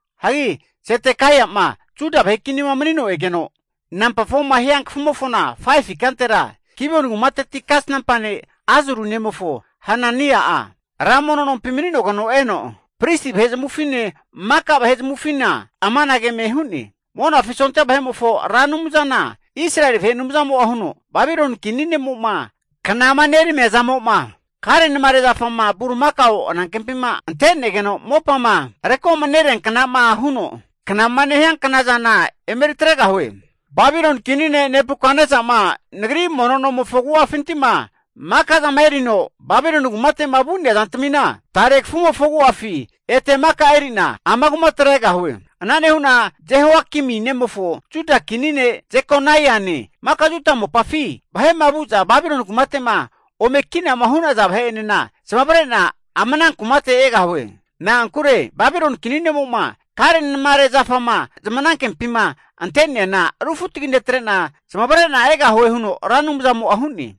Hagi Zedekaia'ma Juda vahe kinima manino egeno namba 4ma hia kafumofona 5fu ikantera, Gibioni kumateti kasnampa ne' Azuri nemofo Hanania'a, ra mono nompi mani'nogeno eno, pristi vahe zamavufine maka vahe zamavufinena amanage eme hu'ne. Monafi sondia vahe'mofo Ra Anumzana Israeli vahe Anumzamo'a huno, Babiloni kini nemo'ma knama neramia zamo'ma karenamare zafama bulimakao anankempima antenegeno mopama rekoma nerianknama huno knama nehia knazana emeri atregahue. Babiloni kini ne' Nebukatnesa'ma Nagri mono nomofo agu'afinti'ma maka zama erino Babiloni kumate'ma vu'nea zantamina, tare kafumofo agu'afi ete maka eri'na ama kumatera egahue. Ana nehu'na Jehoiakimi nemofo Juda kini ne' Jekonaiane, maka Juda mopafi vahe'ma vu'za Babiloni kumate'ma ome kinama hu'naza vahe'enena, zamavare'na ama ana kumate egahue. Na'ankure Babiloni kini nemo'ma karenamare zafama zamanankempima ante'neana rufutagi netre'na zamavare'na egahue huno Ra Anumzamo'a hu'ne.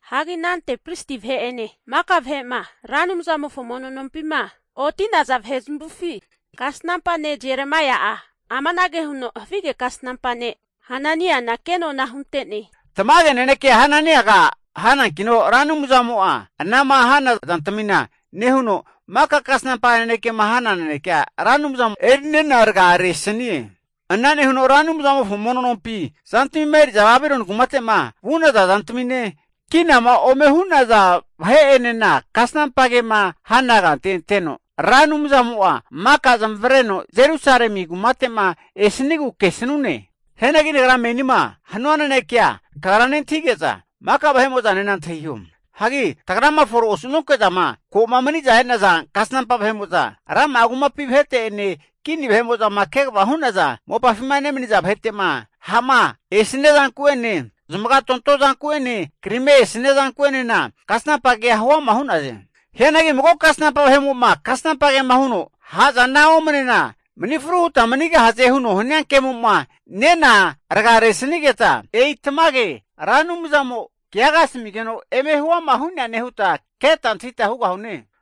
Hagi anante pristi vahe'ene maka vahe'ma, Ra Anumzamofo mono nompima oti'naza vahe zamavufi, kasnampa ne' Jeremaia'a amanage huno havige kasnampa ne' Hananiana kenona hunte'ne. Tamage naneke Hananiaga hanankino, Ra Anumzamo'a anama hana zantamina nehuno, maka kasnampa nanekema hana nanekea Ra Anumzamo'a erinena ragaresanie. Ana nehuno Ra Anumzamofo mono nompinti zantamima eri'za Babiloni kumate'ma vu'naza zantamine, kinama ome hu'naza vahe'enena kasnampa kema hana kante anteno, Ra Anumzamo'a maka zamavareno Jerusalemi kumate'ma esanigu kesanune. Hianagi nagra menima hanua nanekea kagra nentahige'za, maka vahemo'zanena antahiho. Hagi tagrama fore osu'nonke'zama ko'ma mani'za e'naza kasnampa vahe'mo'za, rama'a kumapi vahete'ene, kini vahe'mo'zama kegavama hu'naza mopafima nemaniza vahete'ma ha'ma esania zanku'ene, zamagatonto zanku'ene krima esania zanku'enena kasnampa kea huama hu'naze. Hianagi mago kasnampa vahemo'ma kasnampa kema huno, ha' zana omanena mani fru huta manigahaze huno hania kemo'ma nena rgaresanigeta, e'i tamage Ra Anumzamo keaga asamigeno eme huama hu'neane huta keta antahita hugahune.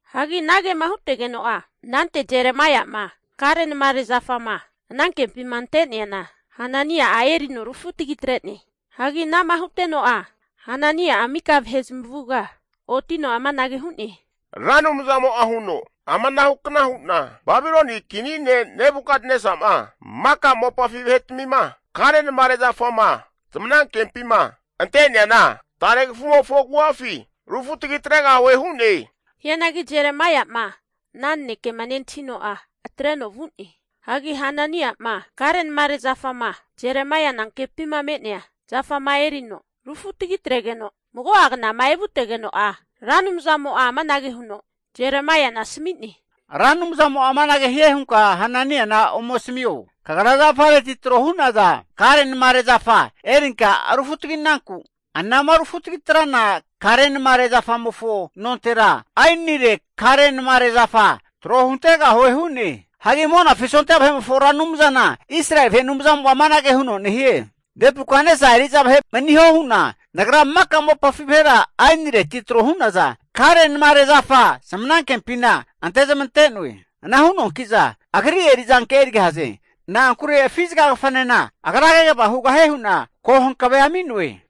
Hagi anagema hutegeno'a anante Jeremaia'ma karenamare zafama anankempima ante'neana, Hanania'a erino rufutagi atre'ne. Hagi ana'ma huteno'a Hanania'a mika vahe zamavuga otino amanage hu'ne, Ra Anumzamo'a huno, ama ana hukna hu'na Babiloni kini ne' Nebukatnesa'ma maka mopafi vahetamima, karenamare zafama zamanankempima ante'neana tare kafumofo agu'afi rufutagi atregahue hu'ne. Hianagi Jeremaia'ma ana nanekema nentahino'a atreno vu'ne. Hagi Hanania'ma karenamare zafama Jeremaia anankempima me'nea zafama erino rufutagi atretegeno, mago'a knama evutegeno'a Ra Anumzamo'a amanage huno Jeremaiana asami'ne. Ra Anumzamo'a amanage hie hunka Hananiana ome asamio. Kagra zafareti tro hu'naza karenamare zafa erinka rufutagi'nanku, anama rufutagi trana kare'namare zafamofo nontera aenire karenamare zafa tro huntegahue hu'ne. Hagi Monafi sondia vahe'mofo Ra Anumzana Israeli vahe Anumzamo'a amanage huno nehie, Nebukatnesa eri'za vahe maniho hu'na Nagra maka mopafi vahera aenireti tro hu'naza karenamare zafa zamanankempina ante zamante'noe. Ana hu'noanki'za agri eri'zanke erigahaze. Na'ankure afizaga kafa'nena agra kegava hugahie hu'na ko hankavea ami'noe.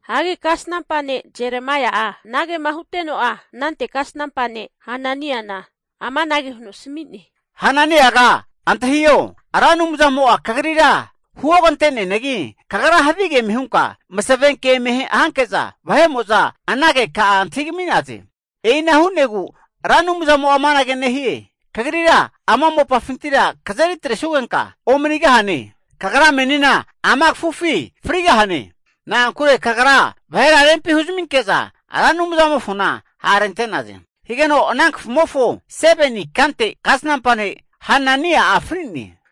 Hagi kasnampa ne' Jeremaia'a anagema huteno'a anante kasnampa ne' Hananiana amanage huno asami'ne. Hananiaga antahio, Ra Anumzamo'a kagrira huogante'neanagi, kagra havige eme hunka masavenke eme hanke'za vahe'mo'za ana keka'a antahigami'naze. E'ina hu'negu Ra Anumzamo'a amanage nehie, Kagrira ama mopafintira kazeri atresugenka omanigahane. Kagra meni ama kafufi frigahane. Na'ankure kagra vahera rempi huzaminke'za Ra Anumzamofona ha' rente'naze. Higeno ana kafumofo 7ni ikante kasnampa ne' Hanania'a fri'ne.